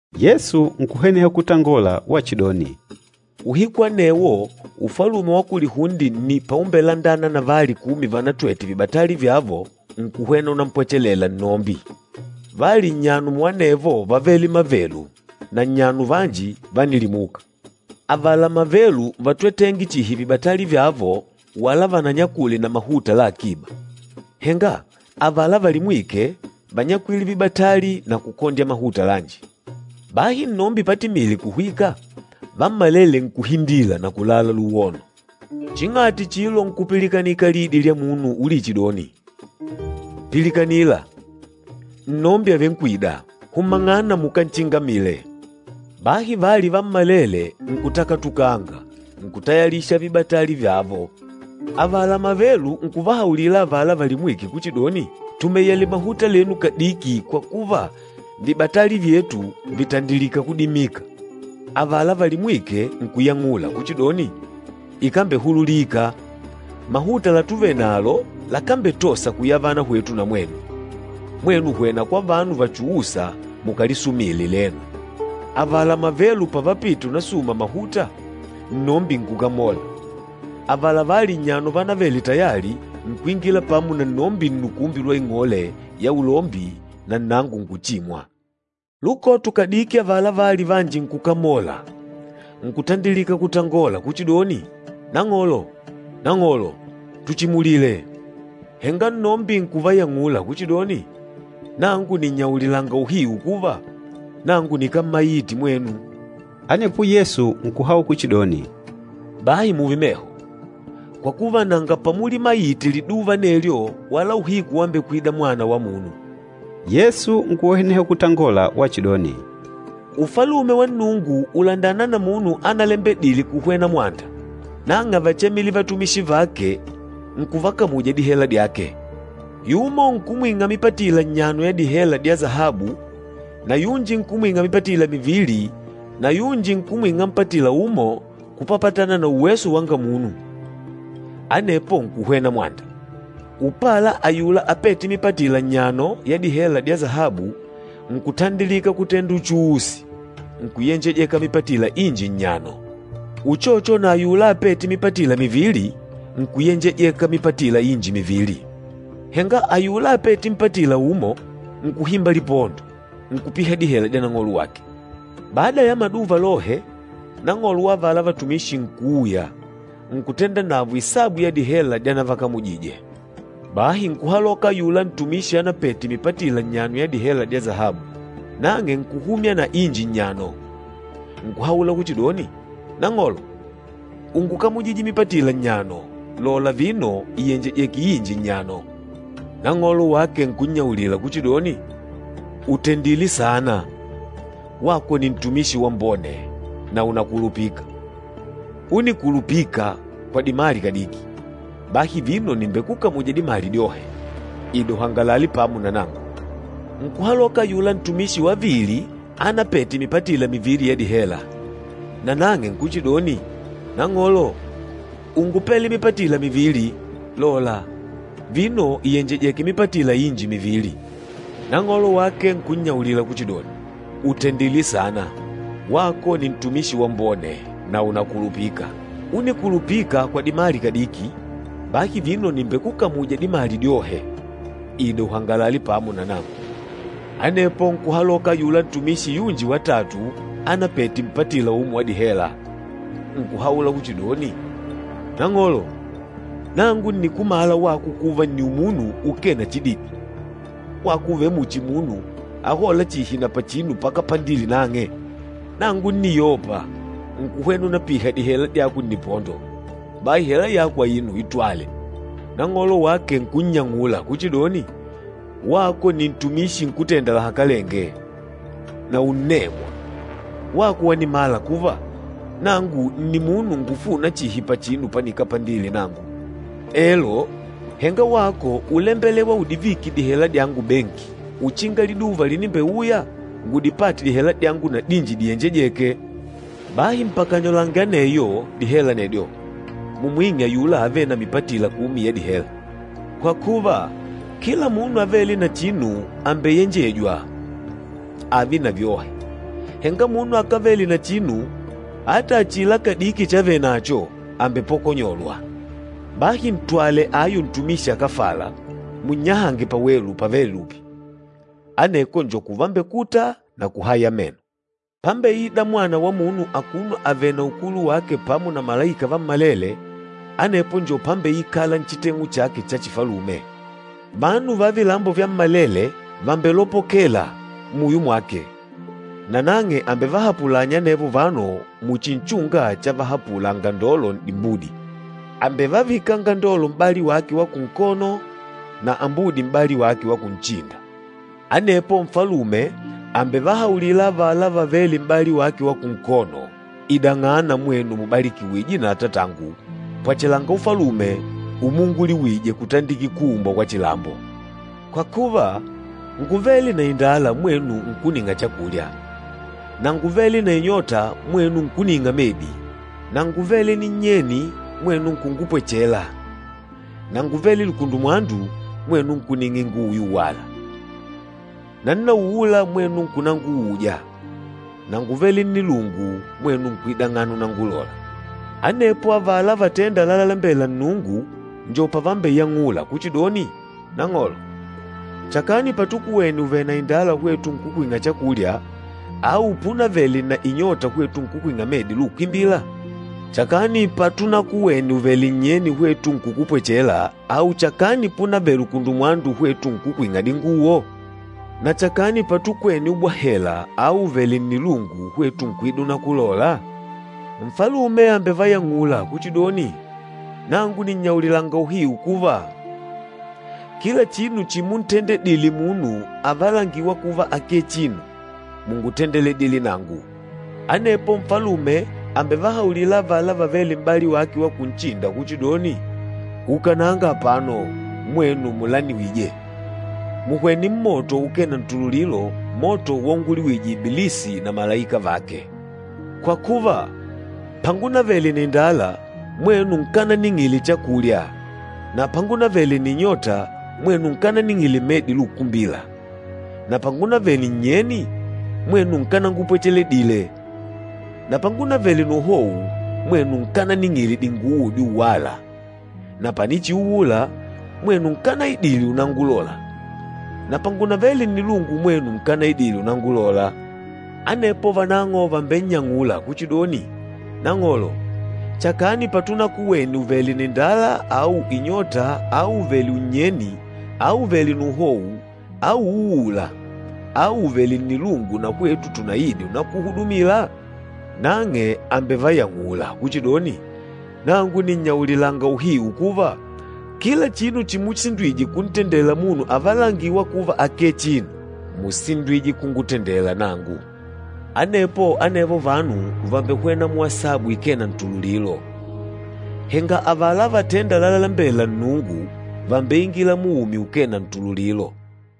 Yesu nkuhweneha kutangola wachidoni, “Uhiku anewo Ufalume wa kulihunde nni paumbelandana na vali kumi vanatwete vibatali vyavo nkuhwena unampwechela nnombi. Vali nnyano muanevo vávele mavelu na nnyano vanji vánilimuka. Avala mavelu vátwetenge chihi vibatali vyavo wala vananyakule na mahuta la akiba. Henga avala valimwîke ványakwile vibatali na kukondya mahuta lanji. Bahi nnombi patimîle kuhwika, vammalele nkuhindila na kulala luwono. Ching'ati chilo nkupilikanika lidi lya munu ulichidoni, ‘Pilikanila, nnombi àvenkwida! Humang'ana mukanchingamile!’ Bahi vali vammalele nkutakatukanga, nkutayalisha vibatali vyavo. Avala mavelu nkuvahaulila avala valimwîke kuchidoni, ‘Tumeyele mahuta lenu kadiki kwa kuva vibatali vyetu vitandilika kudimika.’ Avala valimwîke nkuyang'ula kuchidoni, ‘Ikambehululika, mahuta latuvenalo lakambetosa kuyavana hwetu na mwenu. Mwenu hwena kwa vanu vachuûsa mukalisumile lenu.’ Avala mavelu pavapite unasuma mahuta, nnombi nkukamola. Avala vali nnyano vanavêle tayali, nkuingila pamo na nnombi nnukumbi lwa ing'ole ya ulombi na nnango nkuchimwa. Lukoto kadiki avala vali vanji nkukamolanga, nkutandilika kutangola kuchidoni, ‘Nang'olo, nang'olo, tuchimulile!’ Henga nnombi nkuvayang'ula kuchidoni, ‘Nangu nìnnyaulilanga uhiu kuva, nangu nikámmaite mwenu.’” Anepo Yesu nkuhaula kuchidoni, “Bahi mùùve meho, kwa kuva nanga pamulimaite liduva anelyo wala uhiku wambekwida Mwana wa Munu.” Yesu nkuhweneha kutangola wachidoni, “Ufalume wa Nnungu ùlandana na munu ánalembedîle kuhwena mwanda. Nang'e ávachemile vatumishi vake, nkuvakamuja dihela dyake. Yumo nkumwing'a mipatila nnyano ya dihela dya sahabu na yunji nkumwing'a mipatila mivili na yunji nkumwing'a mpatila umo kupapatana na uweso wanga munu. Anepo nkuhwena mwanda. Upala ayula apête mipatila nnyano ya dihela dya sahabu nkutandilika kutenda uchuusi, nkuyenjejeka mipatila inji nnyano. Uchocho na ayula apête mipatila mivili, nkuyenjejeka mipatila inji mivili. Henga ayula apête mpatila umo, nkuhimba lipondo, nkupiha dihela dya nang'olo wake. Bada ya maduva lohe, nang'olo wa avala vatumishi nkuuya, nkutenda navo isabu ya dihela dyanavakamujije. Bahi nkuhaloka ayula ntumishi anapete mipatila nnyano ya dihela dya sahabu, nang'e nkuhumya na inji nnyano, nkuhaula kuchidoni, ‘Nang'olo, úngukamujidye mipatila nnyano, lola vino ìyenjejeke inji nnyano.’ Nang'olo wake nkunnyaulila kuchidoni, ‘Ùtendile saana, wako nni ntumishi wambone, na ùnakulupika. Únikulupika kwa dimali kadiki, bahi vino nìmbekukamuja dimali dyohe. Ida uhangalale pamo na nangu!’ Nkuhaloka ayula ntumishi wavili anapete mipatila mivili ya dihela, nanang'e, nkuchidoni, ‘Nang'olo, úngupele mipatila mivili, lola, vino ìyenjejeke mipatila inji mivili.’ Nang'olo wake nkunnyaulila kuchidoni, ‘Ùtendile saana, wako nni ntumishi wambone, na ùnakulupika. Únikulupika kwa dimali kadiki, bahi vino nìmbekukamuja dimali dyohe. Ida uhangalale pamo nangu!’ Anepo nkuhaloka ayula ntumishi yunji watatu anapete mpatila umo wa dihela, nkuhaula kuchidoni, ‘Nang'olo, nangu ǹnikumala wako kuva, nni umunu ukee na chididi, wako ùvele muchi munu ahôla chihi na pachinu pakapandile nang'e. Nangu ńniyopa, nkuhwena unapiha dihela dyako nnipondo. Bahi hela yako aino, itwale.’ Nang'olo wake nkunnyang'ula kuchidoni, ‘Wako nni ntumishi nkútenda lahakalenge, na unnemwa! Wako wanimala kuva, nangu nni munu ngufûna chihi pachinu panikapandile nangu. Elo, henga wako úlembelewa udivike dihela dyangu benki, uchinga liduva linimbeuya ngudipate dihela dyangu na dinji diyenjejêke. Bahi mpakanyolange aneyo, dihela anedyo, mumwing'e ayula avêle na mipatila kumi ya dihela. Kwa kuva, kila munu avêle na chinu àmbeyenjejwa ààve na vyohe, henga munu akávele na chinu ata achila kadiki chavenacho àmbepokonyolwa. Bahi ntwale ayu ntumishi akáfala, munnyahange pawelu pavêle lupi. Aneko njo kuvambekuta na kuhaya meno.’” “Pámbeìdà Mwana wa Munu akuno avèlè na ukulu wake pamo na malaika vammalele, anepo njo pámbeikàlà nchiteng'u chake cha chifalume. Vanu va vilambo vyammalele vàmbelopokela muyo mwake, nanang'e àmbevahapulanya anevo vanu muchi nchunga chavahapula angandolo n'dimbudi. Àmbevavika angandolo m'bali wake wa kunkono na ambudi m'bali wake wa kunchinda. Anepo Nfalume àmbevahaulila avala vavêle m'bali wake wa kunkono, ‘Idang'ana, mwenu mubalikiwije na Atatangu, pwachelanga Ufalume umuunguliwije kutandikila kuumbwa kwa chilambo. Kwa kuva ngúvele na indala mwenu nkuning'a chakulya, na ngúvele na inyota mwenu nkuning'a medi, na ngúvele ninnyeni mwenu nkungupwechela, na ngúvele lukundumwandu, mwenu nkuning'a inguwo yuwala, na nnauula mwenu nkunanguuja, na ngúvele nnilungu mwenu nkuidang'ana unangulola.’ Anepo avala vatênda lalalembela Nnungu njo pavambeyang'ula kuchidoni, ‘Nang'olo, chakani patukuwene uvèlè na indala hwetu nkukwing'a chakulya, au púnavele na inyota hwetu nkukwing'a medi lukumbila? Chakani patunakuwene uvèlè nnyeni, hwetu nkukupwechela, au chakani púnavele lukundumwandu, hwetu nkukwing'a dinguwo? Na chakani patukwene ubwahela au uvèlè nnilungu, hwetu nkuida unakulola?’ Nfalume àmbevayang'ula kuchidoni, ‘Nangu nìnnyaulilanga uhiu kuva, kila chinu chimuntendedile munu avalangîwa kuva akee chinu, múngutendedile nangu.’ Anepo Nfalume àmbevahaulila avala vavêle m'bali wake wa kunchinda kuchidoni, ‘Ukananga apano, mwenu mulaniwije! Muhwene mmoto ukee na ntululilo, moto waunguliwije Ibilisi na malaika vake! Kwa kuva, pangunavele na indala, mwenu nkananing'ile chakulya na pangunavele na inyota, mwenu nkananing'ile medi lukumbila na pangunavele ninnyeni, mwenu nkanangupwecheledile na pangunavele na uhou, mwenu nkananing'ile dinguwo dyuwala na panichiuula, mwenu nkanaidile unangulola na pangunavele nnilungu mwenu nkanaidîle unangulola.’ Anepo vanang'o vàmbennyang'ula kuchidoni, ‘Nang'olo, chakani patunakuwene uvèlè na indala au inyota au uvèlè unnyeni au uvèlè na uhou au uuùlà au uvèlè nnilungu, na hwetu tunaide unakuhudumila?’ Nang'e àmbevayang'ula kuchidoni, ‘Nangu nìnnyaulilanga uhiu kuva, kila chinu chimusindwije kuntendela munu avalangîwa kuva akee chinu, músindwije kungutendela nanangu.’ Anepo anevo vanu vambehwena muasabu ikee na ntululilo, henga avala vatênda lalalembela Nnungu, vàmbeingila muumi ukee na ntululilo.”